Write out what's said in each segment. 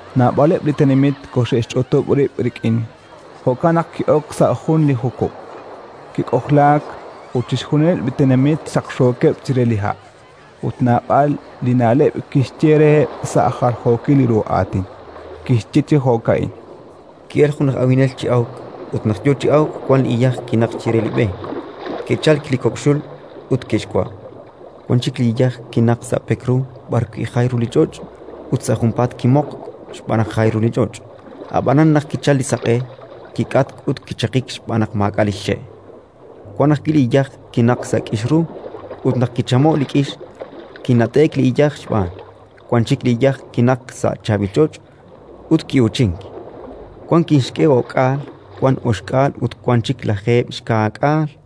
Naab'aleb' li tenamit koxe'xch'utub' rib' rik'in: jo'kan naq ki'ok sa' jun li jukub', kik'ojlaak, ut chixjunileb' li tenamit xaqxookeb' chire li ha'. Ut naab'al li na'leb' kixye reheb' sa' jaljookil ru aatin. Kixye chi jo'ka'in: “Ki'elk jun aj awinel chi awk. Ut naq yo chi awk, wan iyaj kinaqk chire li b'e: ke'chalk li kok' xul ut ke'xwa'. Wan chik iyaj kinaqk sa' pek ru b'arwi' jay ru li ch'och', ut sa' junpaat kimoqk xb'aan naq jay ru li ch'och'; ab'an, naq kichalk li saq'e, kik'atk ut kichaqik xb'aan naq maak'a' li xxe'. Wan ajwi' iyaj kinaqk sa' k'ix ru ut, naq kichamo'k li k'ix, kinat'e'k li iyaj xb'aan. Wan chik iyaj kinaqk sa' chaab'il ch'och' ut ki'uuchink; wan kixk'e o'k'aal, wan oxk'aal ut wan chik lajeeb' xka'k'aal.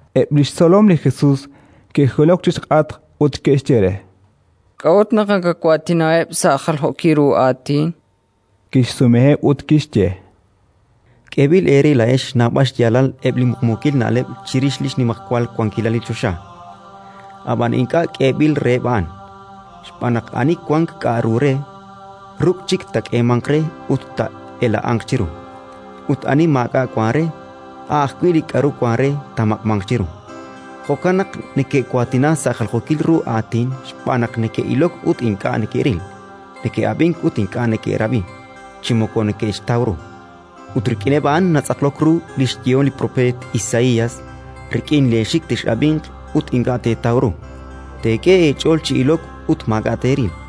Eb' li xtzolom li Jesus ke'jilok chi xk'atq ut ke'xye re: “K'a'ut naq nakawaatinaheb' sa' jaljookil ru aatin?”. Kixsumeheb' ut kixye: “K'eeb'il eere laa'ex xnawb'al xyaalal eb' li muqmuukil na'leb' chirix li xnimajwal wankilal li choxa, ab'an ink'a' k'eeb'il reheb' a'an. Xb'aan naq ani wank k'aru re, ruk' chik taak'eemanq re ut taa'ela'anq chiru; ut ani maak'a' wank re, a' ajwi' li k'aru wank re taamaq'manq chiru. Jo'kan naq neke'waatina sa' jaljookil ru aatin. Xb'aan naq neke'ilok ut ink'a' neke'ril, neke'ab'ink ut ink'a' neke'rab'i, chi moko neke'xtaw ru. Ut rik'ineb' a'an natz'aqlok ru li xyehom li propeet Isaías: «Rik'in leexik tex'ab'inq ut ink'a' teetaw ru; teek'e eech'ool chi ilok ut maak'a' teeril.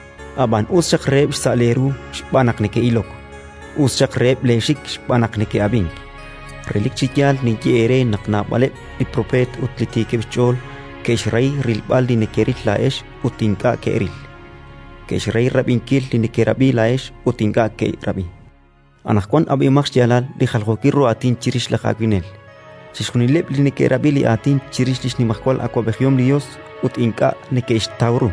“Ab'an us xaq reheb' xsa' leeru xb'aan naq neke'ilok; us xaq reheb' leexik xb'aan naq neke'ab'ink. Relik chi yaal ninye eere naq naab'aleb' li propeet ut li tiikeb' xch'ool ke'xrahi rilb'al li nekeril laa'ex ut ink'a' ke'ril; ke'xrahi rab'inkil li nekerab'i laa'ex ut ink'a' ke'rab'i. “Anaqwan ab'ihomaq xyaalal li jaljookil ru aatin chirix laj awinel. Chixjunileb' li neke'rab'i li aatin chirix li xnimajwal awab'ejihom li Yos ut ink'a' neke'xtaw ru,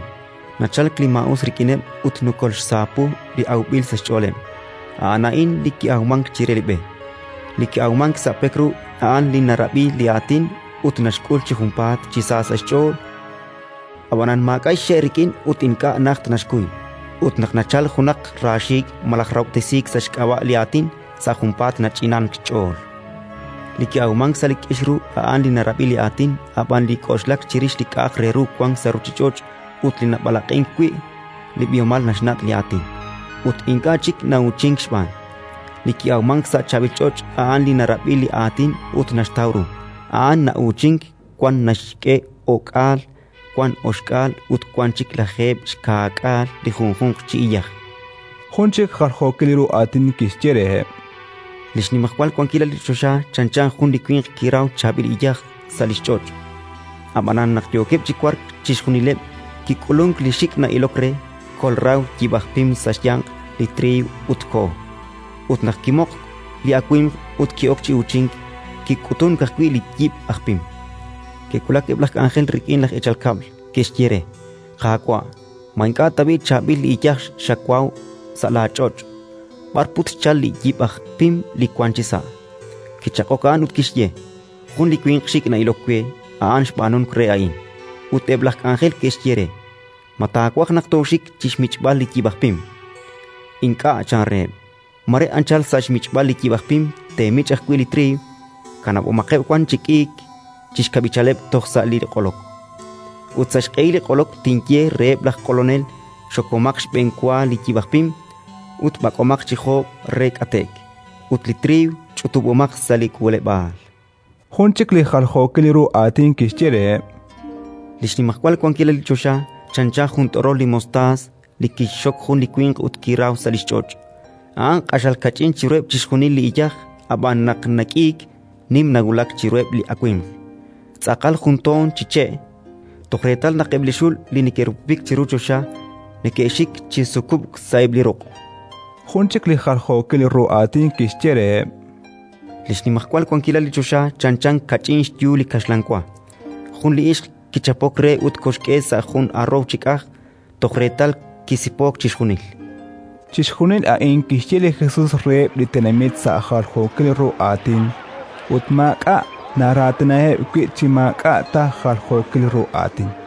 nachalk li maa'us rik'ineb' ut nokolxsaapu li awb'il sa' xch'ooleb': a'an a'in li ki'awmank chire li b'e. Li ki'awmank sa' pek ru, a'an li narab'i li Aatin ut naxk'ul chi junpaat chi sa sa' xch'ool; ab'an maak'a' xxe' rik'in ut ink'a' najt naxkuy. Ut naq nachalk junaq raaxiik' malaj rahob'tesiik sa' xk'ab'a' li Aatin, sa' junpaat nach'inank xch'ool. Li ki'awmank sa' li k'ix ru a'an li narab'i li Aatin, ab'an li k'oxlak chirix li k'a'aq re ru wank sa' ruuchich'och' ut li nab'alaq'ink wi' li b'ihomal naxnat' li Aatin, ut ink'a' chik na'uuchink xb'aan. Li ki'awmank sa' chaab'il ch'och' a'an li narab'i li Aatin ut naxtaw ru; a'an na'uuchink: wan naxk'e o'k'aal, wan oxk'aal ut wan chik lajeeb' xka'k'aal li junjunq chi iyaj”. Jun chik jaljookil ru aatin kixye reheb': “Li xnimajwal wankilal li choxa chanchan jun li winq kiraw chaab'il iyaj sa' li xch'och'. Ab'anan, naq yookeb' chi wark chixjunileb', kik'ulunk li xik' na'ilok re, kolraw li yib' aj pim sa' xyanq li triiw ut koho. Ut naq kimoqk li awimq ut ki'ok chi uuchink, kik'utunk ajwi' li yib' aj pim. Ke'wulak eb' laj k'anjel rik'in laj eechal kab'l, ke'xye re: «Qaawa', ma ink'a' tab'i' chaab'il li iyaj xawaw sa' laach'och'? B'ar put xchalk li yib' aj pim li wank chisa'?». Kichaq'ok a'an ut kixye: «Jun li winq xik' na'ilok we, a'an xb'aanunk re a'in». Ut eb' laj k'anjel ke'xye re: «Ma taawaj naq tooxik chi xmich'b'al li yib' aj pim?». «Ink'a' -chan reheb'-. Mare anchal sa' xmich'b'al li yib' aj pim teemich' ajwi' li triiw. Kanab'omaqeb' wan chi k'iik chi xkab'ichaleb' toj sa' li q'olok. Ut sa' xq'ehil li q'olok tinye reheb' laj q'olonel: Xokomaq xb'enwa li yib' aj pim, ut b'ak'omaq chi joob' re k'ate'k; ut li triiw ch'utub'omaq sa' li k'uuleb'aal»”. Jun chik li jaljookil ru aatin kixye reheb': “Li xnimajwal wankilal li choxa chanchan jun t'orol li mostaas Li mostaas a'an jun li che'. li kixxok jun li winq ut kiraw sa' li xch'och'. A'an q'axal kach'in chiruheb' chixjunil li iyaj; ab'an, naq nak'iik, nim nawulak chiruheb' li awimq, tz'aqal juntoon chi che', toj reetal naq eb' li xul li neke'rupupik chiru choxa neke'xik chi sukub'k sa'eb' li ruq'”. Jun chik li jaljookil ru aatin kixye reheb': “Li xnimajwal wankilal li choxa chanchan kach'in xyu li kaxlan wa. Jun li ixq kichapok re ut koxk'e sa' jun aroow chi k'aj, toj reetal kisipook chixjunil”. Chixjunil a'in kixye li Jesus reheb' li tenamit sa' jaljookil ru aatin, ut maak'a' naraatinaheb' wi' chi maak'a' ta jaljookil ru aatin.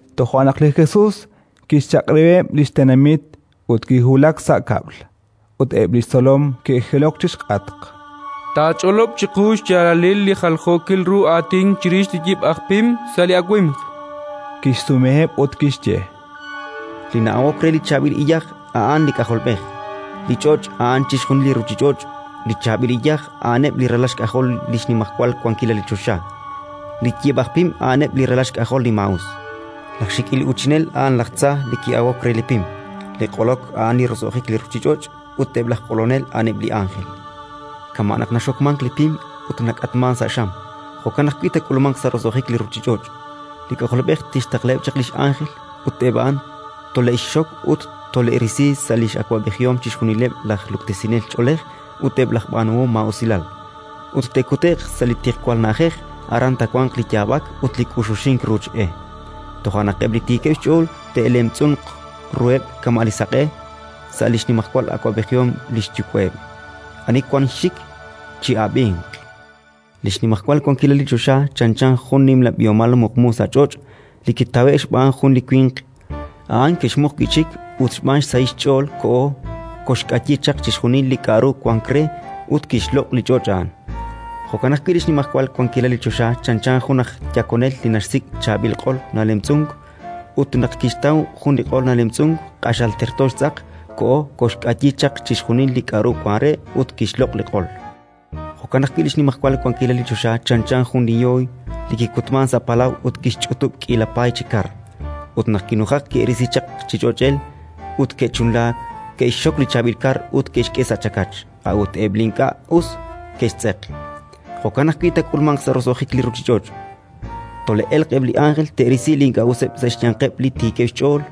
Toja' naq li Jesus kixchaq'rab'iheb' li tenamit ut kiwulak sa' kab'l. Ut eb' li xtzolom ke'jilok chi xk'atq: “Taach'olob' chiqu xyaalal li jaljookil ru aatin chirix li yib' aj pim sa' li awimq”, chankeb'. Kixsumeheb' ut kixye: “Li na'awok re li chaab'il iyaj a'an li K'ajolb'ej. Li ch'och' a'an chixjunil li ruuchich'och'; li chaab'il iyaj a'aneb' li ralal xk'ajol li xnimajwal wankilal li choxa; li yib' aj pim a'aneb' li ralal xk'ajol li maa'us; laj xik'il uuchinel a'an laj tza li ki'awok re li pim. Li q'olok a'an li roso'jik li ruuchich'och', ut eb' laj q'olonel a'aneb' li ánjel. Kama' naq naxokmank li pim ut nak'atmank sa' xam, jo'kan ajwi' taak'ulmanq sa' roso'jik li ruuchich'och'. Li K'ajolb'ej tixtaqlaheb' chaq li x'ánjel, ut eb' a'an tole'xxok ut tole'risi sa' li x'awab'ejihom chixjunileb' laj luktesinel ch'oolej ut eb' laj b'aanuhom maa'usilal, ut te'kute'q sa' li tiqwal na'ajej: aran taawanq li yaab'ak ut li k'uxuxink ruuch e. Toja' naq eb' li tiikeb' xch'ool te'lemtz'unq ruheb' kama' li saq'e, sa' li xnimajwal awab'ejihom li xYuwa'eb'. Ani wank xxik, chi'ab'inq. “Li xnimajwal wankilal li choxa chanchan jun nimla b'ihomal muqmu sa' ch'och' li kitawe'k xb'aan jun li winq. A'an kixmuq wi' chik ut, xb'aan xsahil li xch'ool, koho, koxk'ayi chaq chixjunil li k'aru wank re ut kixloq' li ch'och' a'an. “Jo'kan ajwi' li xnimajwal wankilal li choxa chanchan jun aj yakonel li naxsik' chaab'il q'ol nalemtz'unk. Ut naq kixtaw jun li q'ol nalemtz'unk q'axal terto xtz'aq, koho, koxk'ayi chaq chixjunil li k'aru wank re ut kixloq' li q'ol. “Jo'kan ajwi' li xnimajwal wankilal li choxa chanchan jun li yooy li kikutmank sa' palaw ut kixch'utub' k'iila paay chi kar. Ut naq kinujak, ke'risi chaq chi ch'och'el, ut ke'chunlaak: ke'xxok li chaab'il kar ut ke'xk'e sa' chakach, a'ut eb' li ink'a' us ke'xtz'eq. Jo'kan ajwi' taak'ulmanq sa' roso'jik li ruuchich'och': tole'elq eb' li ánjel, te'risi li ink'a' useb' sa' xyanqeb' li tiikeb' xch'ool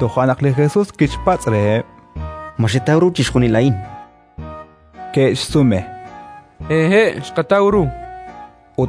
Toja' naq li Jesus kixpatz' reheb': —Ma xetaw ru chixjunil a'in? Ke'xsume: —Hehe', xqataw ru, chankeb'.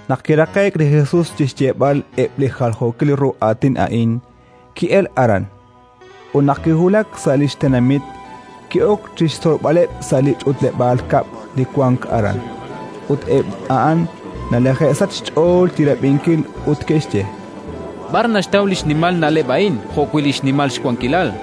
Naq kiraqe'k li Jesus chi xyeeb'al eb' li jaljookil ru aatin a'in, ki'elk aran. Ut naq kiwulak sa' li xtenamit, ki'ok chi xtzolb'aleb' sa' li ch'utleb'aal kab'l li wank aran. Ut eb' a'an nalaje'sachk xch'ool chi rab'inkil ut neke'xye: —B'ar naxtaw li xnimal na'leb' a'in jo'wi' li xnimal xwankilal?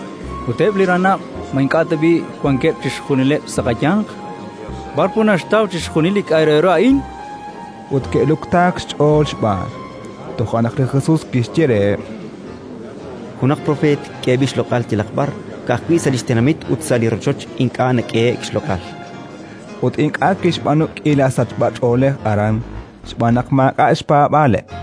Ut eb' li ranab' ma ink'a' tab'i' wankeb' chixjunileb' sa' qayanq? B'ar put naxtaw chixjunil li k'a' re ru a'in? Ut ke'luktaak xch'ool xb'aan. Toja' naq li Jesus kixye reheb': —Junaq propeet k'eeb'il xloq'al yalaq b'ar. Ka'ajwi' sa' li xtenamit ut sa' li rochoch ink'a' nak'ehe'k xloq'al. Ut ink'a' kixb'aanu k'iila sachb'ach'oolej aran, xb'aan naq maak'a' xpaab'aaleb'.